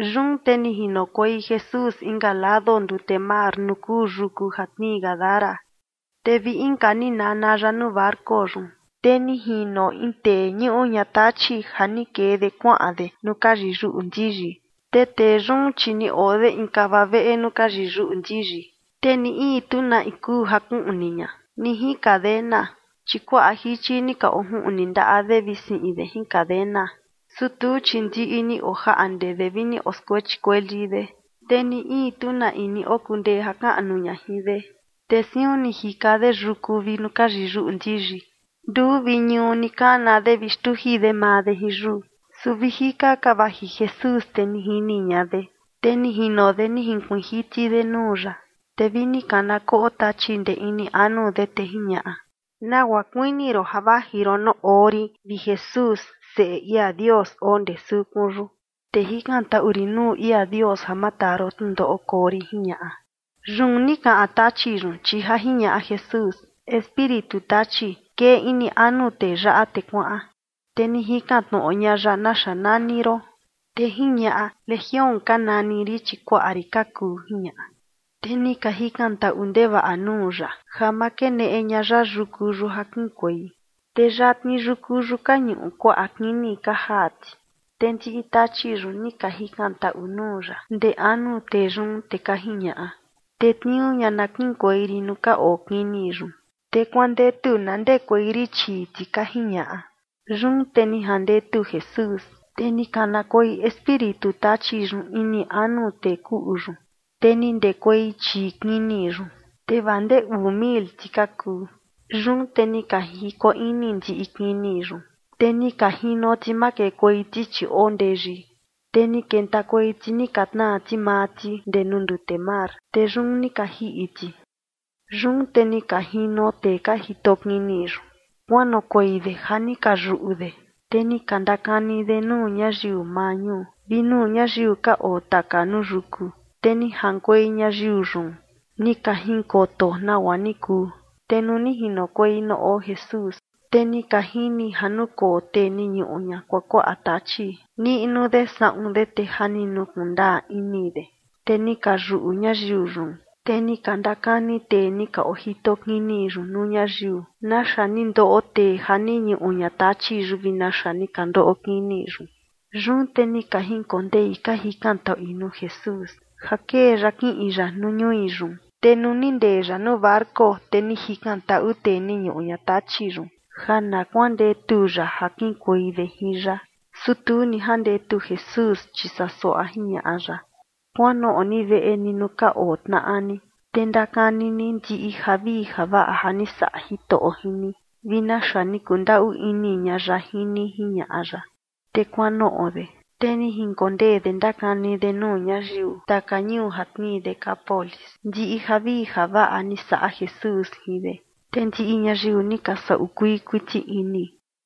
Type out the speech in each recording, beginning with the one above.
Yun te ni jinokuei Jesús inka lado ndute mar nuu kuu yuku ja tnii Gadara. Te vi inka ni nana ya nuu barco yun, te ni jino in tee ñuꞌu ña tachi ja ni kee de kuaꞌan de nuu ka yiyuꞌu ndiyi. Te tee yun, chi ni oo de in kava veꞌe nuu ka yiyuꞌu ndiyi, te ni in tu na in kuu ja kuꞌni ña, ni jin cadena. Chi kuaꞌa jichi ni ka ojuꞌni ndaꞌa de vi siꞌin de jin cadena, su tuu, chi ndiꞌi ni ojaꞌnde de vi ni oskuechi kueli de, te ni in tu ni okundee ja kaꞌnu ña jin de. Te siun ni jika de yuku vi nuu ka yiyuꞌu ndiyi. Nduu vi ñuu ni kana de vi xtuji de maa de jin yuu. Su vi jika ka vaji Jesús, te ni jini ña de, te ni jino de ni jinkuiin jiti de nuu ya. Te vi ni kana koꞌo tachi ndee ini anu de, te jiñaꞌa: ―¿Nagua kuini ron ja vaji ron nuu oo rin, vi Jesús, Seꞌe ia Dios oo ndee sukun yun? Te jikantaꞌu rin nuu ia Dios ja ma taa ron tnundoꞌo koo rin ―jiñaꞌa. Yun ni kaꞌan tachi yun, chi ja jiñaꞌa Jesús: ―Espíritu tachi, kee ini anu tee yaꞌa te kuaꞌan. Te ni jikan tnoꞌo ña ya: ―¿Naxa nani ron? Te jiñaꞌa: ―Legión ka nani rin, chi kuaꞌa rin ka kuu ―jiñaꞌa. Te ni ka jikantaꞌu ndevaꞌa nuu ya ja ma keneꞌe ña ya yuku yun ja kiꞌinkuei. Te yatni yuku yun ka ñuꞌu kuaꞌa kini ka jaa ti. Te ndiꞌi tachi yun ni ka jikantaꞌu nuu ya ndee anu tee yun, te ka jiñaꞌa: ―Tetniuu ña na kiꞌinkuei rin nuu ka oo kini yun. Te kuandetu na ndekuei rin chii ti ―ka jiñaꞌa. Yun te ni jandetu Jesús, te ni kanakuei espíritu tachi yun ini anu tee kuꞌu yun, te ni ndekuei chii kini yun, te vaa ndee uu mil ti ka kuu. Yun te ni ka jiko ini ndiꞌi kini yun, te ni ka jino ti makekuei ti, chi oo ndeyi, te ni kentakuei ti, ni ka tnaa ti maa ti ndee nuu ndute mar, te yun ni ka jiꞌi ti. Yun te ni ka jino tee ka jito kini yun, kuanoꞌokuei de ja ni ka yuꞌu de, te ni ka ndakani de nuu ñayiu maa ñuu vi nuu ñayiu ka oo taka nuu yuku, te ni jaꞌankuei ñayiu yun, ni ka jinkoto nagua ni kuu. Te nuu ni jinokuei nuu oo Jesús, te ni ka jini ja nukoo tee ni ñuꞌu ña kuakuaꞌa tachi, niꞌnu de saꞌun de, te ja ni nukuꞌun ndaa ini de, te ni ka yuꞌu ñayiu yun. Te ni ka ndakani tee ni ka ojito kini yun nuu ñayiu naxa ni ndoꞌo tee ja ni ñuꞌu ña tachi yun vi naxa ni ka ndoꞌo kini yun. Yun te ka jinkondei ka jikantaꞌui nuu Jesús ja kee ya kiꞌin ya nuu ñui yun. Te nuu ni ndee ya nuu barco, te ni jikantaꞌu tee ni ñuꞌu ña tachi yun ja na kuandetu ya ja kiꞌinkuei de jin ya. Su tu ni jandetu Jesús, chi saa suaꞌa jiñaꞌa ya: ―Kuanoꞌo ni veꞌe ni nuu ka oo tnaꞌa ni, te ndakani ni ndiꞌi javii javaꞌa ja ni saꞌa Jitoꞌo jin ni, vi naxa ni kundaꞌu ini ña ya jin ni ―jiñaꞌa ya. Te kuanoꞌo de, te ni jinkondee de ndakani de nuu ñayiu taka ñuu ja tnii Decápolis ndiꞌi javii javaꞌa ni saꞌa Jesús jin de. Te ndiꞌi ñayiu ni ka saꞌu kuii kuiti ini.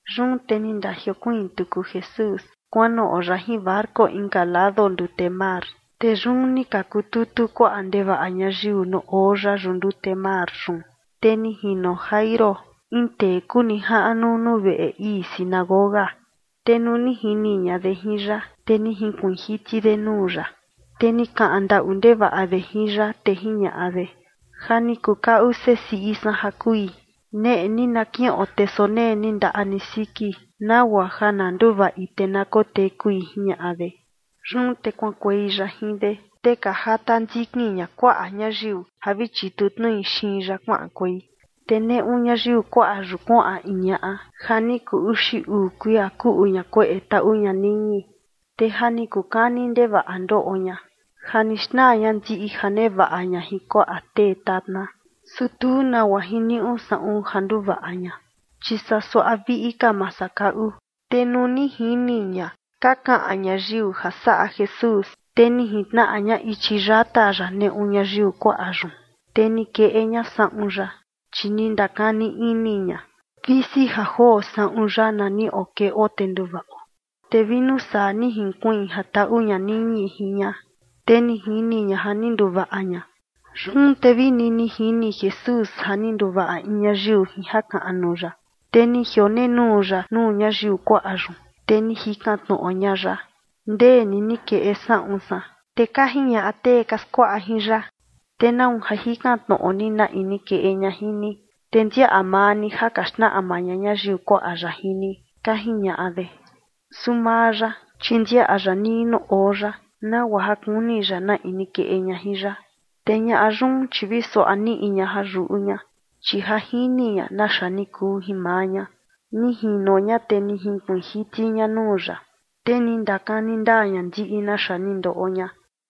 Yun te ni ndajiokuiin tuku Jesús kuanoꞌo ya jin barco inka lado ndute mar, te yun ni ka kututu kuaꞌa ndevaꞌa ñayiu nuu oo ya yuꞌu ndute mar yun. Te ni jino Jairo, in tee kuu nijaꞌnu nuu veꞌe ii sinagoga. Te nuu ni jini ña de jin ya, te ni jinkuiin jiti de nuu ya. Te ni kaꞌan ndaꞌu ndevaꞌa de jin ya, te jiñaꞌa de: ―Ja ni kukaꞌu sesiꞌi san ja kui. Neꞌe ni na kiꞌon, te sonee ni ndaꞌa ni siki, nagua ja na nduvaꞌi te na kotekui ―jiñaꞌa de. Yun te kuaꞌankuei ya jin de, te ka jata ndikin ña kuaꞌa ñayiu ja vi chitu tnui xiin ya kuaꞌankuei. Te neꞌu ñayiu kuaꞌa yun kuaꞌan in ñaꞌa ja ni kuu uxi uu kuia kuꞌu ña kueꞌe taꞌu ña niñi. Te ja ni kuu kani ndevaꞌa ndoꞌo ña, ja ni xnaa ña ndiꞌi ja nevaꞌa ña jin kuaꞌa tee tatna, su tu nagua jiniuꞌu saꞌun ja nduvaꞌa ña, chi saa suaꞌa viꞌi ka masakaꞌu. Te nuu ni jini ña ka kaꞌan ñayiu ja saꞌa Jesús, te ni jintnaꞌa ña ichi yata ya neꞌu ñayiu kuaꞌa yun, te ni keꞌe ña saꞌun ya. Chi ni ndakani ini ña: “Visi ja joo saꞌun ya na niꞌo keꞌo te nduvaꞌo”. Te vi nuu saa ni jinkuiin ja taꞌu ña niñi jin ña, te ni jini ña ja ni nduvaꞌa ña. Yun te vini ni jini Jesús ja ni nduvaꞌa in ñayiu jin jakaꞌnu ya, te ni jionenuu ya nuu ñayiu kuaꞌa yun, te ni jikan tnoꞌo ña ya: ―¿Ndee ni ni keꞌe saꞌun san? Te ka jiñaꞌa tee ka skuaꞌa jin ya: ―¿Te nau ja jikan tnoꞌo ni na in ni keꞌe ña jin ni? Te ndiaꞌa maa ni ja ka xnaꞌma ña ñayiu kuaꞌa yaꞌa jin ni ―ka jiñaꞌa de. Su maa ya, chi ndiaꞌa ya nii nuu oo ya, nagua ja kuni ya na in ni keꞌe ña jin ya. Te ñaꞌa yun, chi vi suaꞌa niꞌi ña ja yuꞌu ña, chi ja jini ña naxa ni kuu jin maa ña. Ni jino ña, te ni jinkuiin jiti ña nuu ya, te ni ndakani ndaa ña ndiꞌi naxa ni ndoꞌo ña.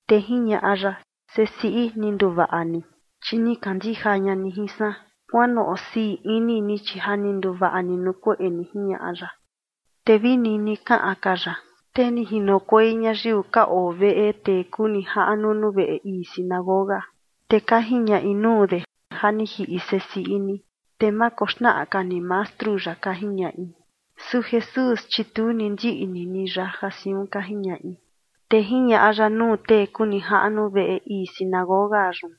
Te jiñaꞌa ya: ―Sesiꞌi, ni nduvaꞌa ni, chi ni kandija ña ni jin san. Kuanoꞌo sii ini ni, chi ja ni nduvaꞌa ni nuu kueꞌe yun ―jiñaꞌa ya. Te vi nini kaꞌan ka ya, te ni jinokuei ñayiu ka oo veꞌe tee kuu nijaꞌnu nuu veꞌe ii sinagoga, te ka jiñaꞌi nuu de: ―Ja ni jiꞌi sesiꞌi ni. Te ma koxnaꞌa ka ni mastru yaꞌa ―ka jiñaꞌi. Su Jesús, chi tu ni ndiꞌni ni ya ja siun ka jiñaꞌi, te jiñaꞌa ya nuu tee kuu nijaꞌnu veꞌe ii sinagoga yun: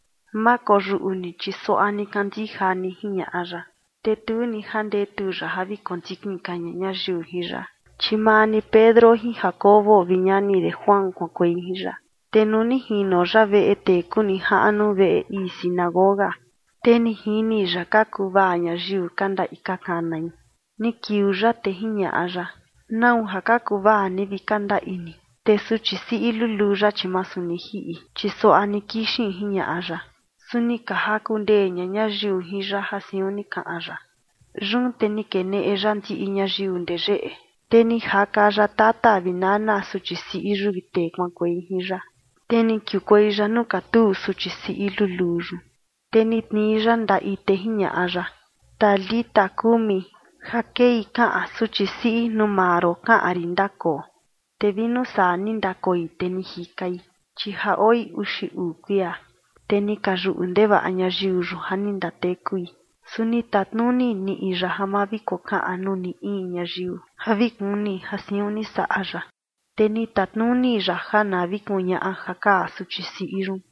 ―Ma koyuꞌu ni, chi suaꞌa ni kandija ni ―jiñaꞌa ya. Te tu ni jandetu ya ja vi kondikin ka ña ñayiu jin ya, chi maa ni Pedro jin Jacobo vi ñani de Juan kuaꞌankuei jin ya. Te nuu ni jino ya veꞌe tee kuu nijaꞌnu veꞌe ii sinagoga, te ni jini ya ka kuvaa ñayiu, ka ndaꞌi ka kanai. Ni kiuu ya, te jiñaꞌa ya: ―¿Nau ja ka kuvaa ni vi ka ndaꞌi ni? Te suchi siꞌi luluu yaꞌa, chi masu ni jiꞌi, chi suaꞌa ni kixin ―jiñaꞌa ya. Su ni ka jaku ndee ña ñayiu jin ya ja siun ni kaꞌan ya. Yun te ni keneꞌe ya ndiꞌi ñayiu ndee yeꞌe, te ni jaka ya tata vi nana suchi siꞌi yun vi tee kuaꞌankuei jin ya, te ni kiukuei ya nuu katuu suchi siꞌi luluu yun. Te ni tnii ya ndaꞌi, te jiñaꞌa ya: ―¡Talita kumi! ―ja kei kaꞌan: Suchi siꞌi, nuu maa ron kaꞌan rin, ndakoo. Te vi nuu saa ni ndakoi, te ni jikai, chi ja oi uxi uu kuia. Te ni ka yuꞌu ndevaꞌa ñayiu yun ja ni ndatekui. Su ni tatnuni niꞌi ya ja ma vi kokaꞌan nuu ni in ñayiu ja vi kuni ja siun ni saꞌa ya, te ni tatnuni ya ja na vi kuñaꞌa ja kaa suchi siꞌi yun.